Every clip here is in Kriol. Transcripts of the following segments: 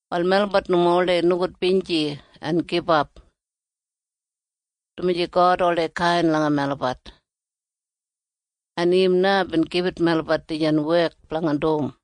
Wal melabat nomo oldei nogudbinji en gibap, dumaji God oldei kain langa melabat, en im na bin gibit melabat dijan wek blanga dum.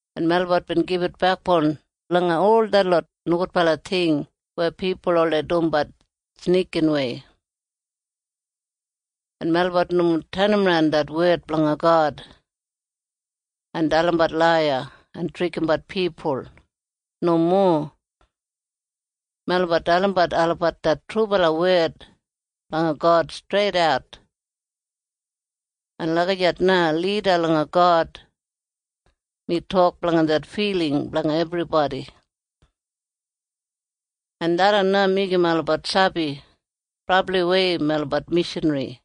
En melabat bin gibit bekboun langa ol detlot nogudbala ting weya pipul oldei dumbat snikinwei. En melabat nomo tenimran det wed blanga God en dalimbat laiya en trikimbat pipul. Nomo. Melabat dalimbat olabat det trubala wed blanga God streidat, en lagijat na lida langa God mi tok blanga det filing blanga ebribodi. En tharran na meigim olabat sabi brabliwei melabat mishanri.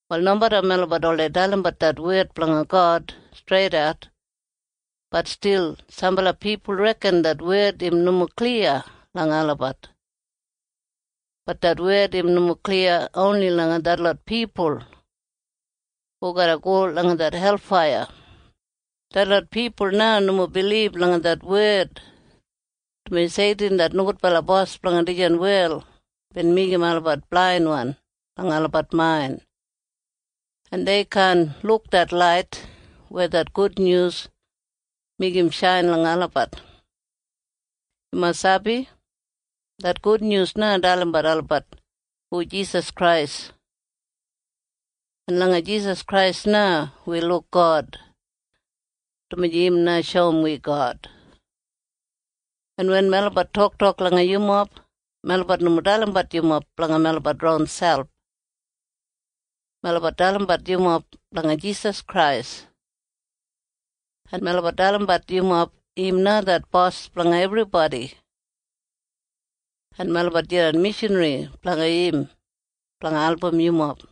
Wal nomeda melabat oldei dalimbat det wed blanga God streidat, bat stil sambala pipul reken det wed im nomo kliya langa olabat. Bat det wed im nomo kliya oni langa detlot pipul hu garra go langa det helfaiya. Detlot pipul na nomo bilib langa det wed, dumaji Seitin det nogudbala bos blanga dijan wel bin meigim olabat blainwan langa olabat main, en dei kaan luk det lait weya det gudnyus meigim shain langa olabat. Yumob sabi? Det gudnyus na dalimbat olabat hu Jisas Krais. En langa Jisas Krais na wi luk God, dumaji im na shoum wi God. En wen melabat toktok langa yumob, melabat nomo dalimbat yumob blanga melabat ronselp. Melabat dalimbat yumob blanga Jisas Krais, en melabat dalim yumob im na det Bos blanga ebribodi, en melabat jidan mishanri blanga im blanga album yumob.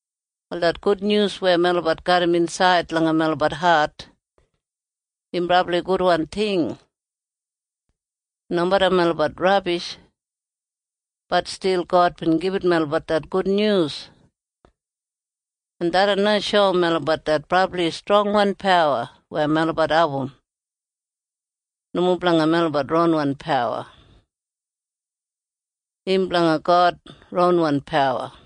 Wal det gudnyus weya melabat garram insaid langa melabat hat im brabli gudwan ting. En nomeda melabat rabishwan, bat stil God bin gibit melabat det gudnyus. En tharran na shoum melabat det brabli strongwan pawa weya melabat abum, im nomo blanga melabat ronwan pawa. Im blanga God ronwan pawa.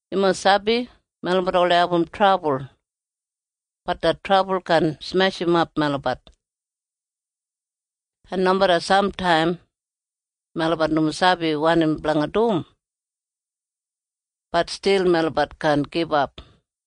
Yumob sabi? Melabat oldei abum trabul. Bat det trabul kaan smeshimap melabat. En nomeda samtaim melabat nomo sabi wanim blanga dum, bat stil melabat kaan gibap.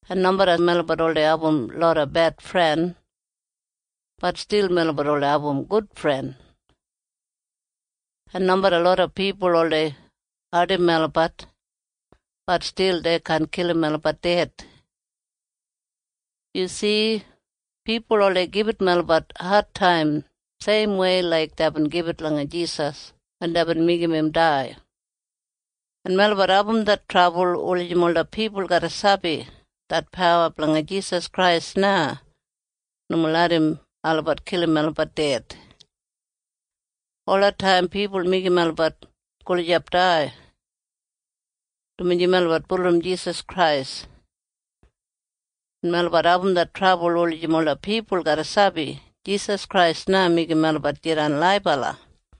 En nomeda melabat oldei abum loda bedfren, bat stil melabat oldei abum gudfren. En nomeda loda pipul oldei ardim melabat, bat stil dei kaan kilim melabat ded. Yu si? Pipul oldei gibit melabat adtaim seimwei laik deibin gibit langa Jisas wen deibin meigim im dai. En melabat abum det trabul wulijim ola pipul garra sabi det pawa blanga Jisas Krais na nomo larram olabat kilim melabat ded. Olataim pipul meigim melabat gulijap dai dumaji melabat bulurrum Jisas Krais. En melabat abum det trabul wulijim ola pipul garra sabi Jisas Krais na meigim melabat jidan laibala.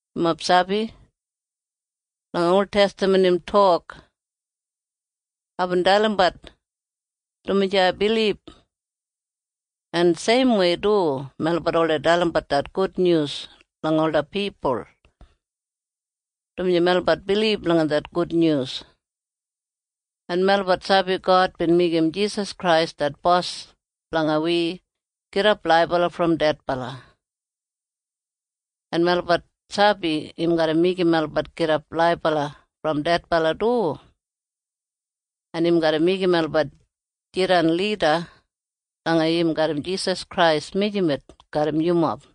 Yumob sabi? Langa oltestaman im tok, “Aibin dalimbat, dumaji ai bilib.” En seimwei du melabat oldei dalimbat det gudnyus langa ola pipul, dumaji melabat bilib langa det gudnyus, en melabat sabi God bin meigim Jisas Krais det Bos blanga wi gidap laibala brom dedbala, en melabat sabi im garra meigim melabat gidap laibala brom dedbala du, en im garra meigim melabat jidan lida langa im garram Jisas Krais mijamet garram yumob.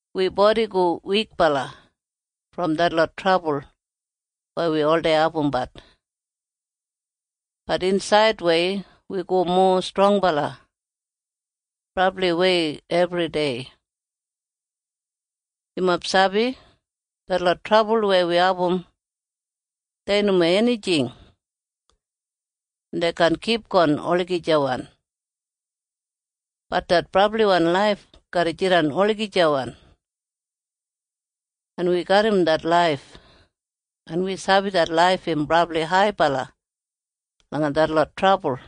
Wi bodi go wikbala brom detlot trabul weya wi oldei abumbat. Bat insaidwei wi go mowa strongbala brabliwei ebridei. Yumob sabi? Detlot trabul weya wi abum dei nomo enijing, en dei kaan kipgon olagijawan. Bat det brabliwan laif garra jidan olagijawan, en wi garram det laif, en wi sabi det laif im brabli haibala langa detlot trabul.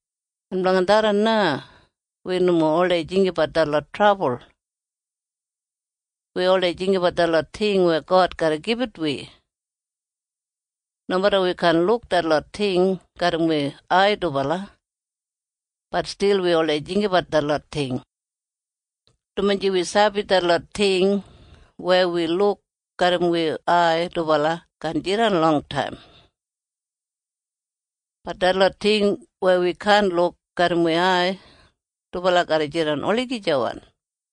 En blanga tharran na wi nomo oldei jinggabat detlot trabul. Wi oldei jinggabat detlot ting weya God garra gibit wi. Nomeda wi kaan luk detlot ting garram wi ai dubala, bat stil wi oldei jinggabat detlot ting, dumaji wi sabi detlot ting weya wi luk garram wi ai dubala kaan jidan longtaim. Bat detlot ting weya wi kaan luk garram wi ai dubala garra jidan olagijawan.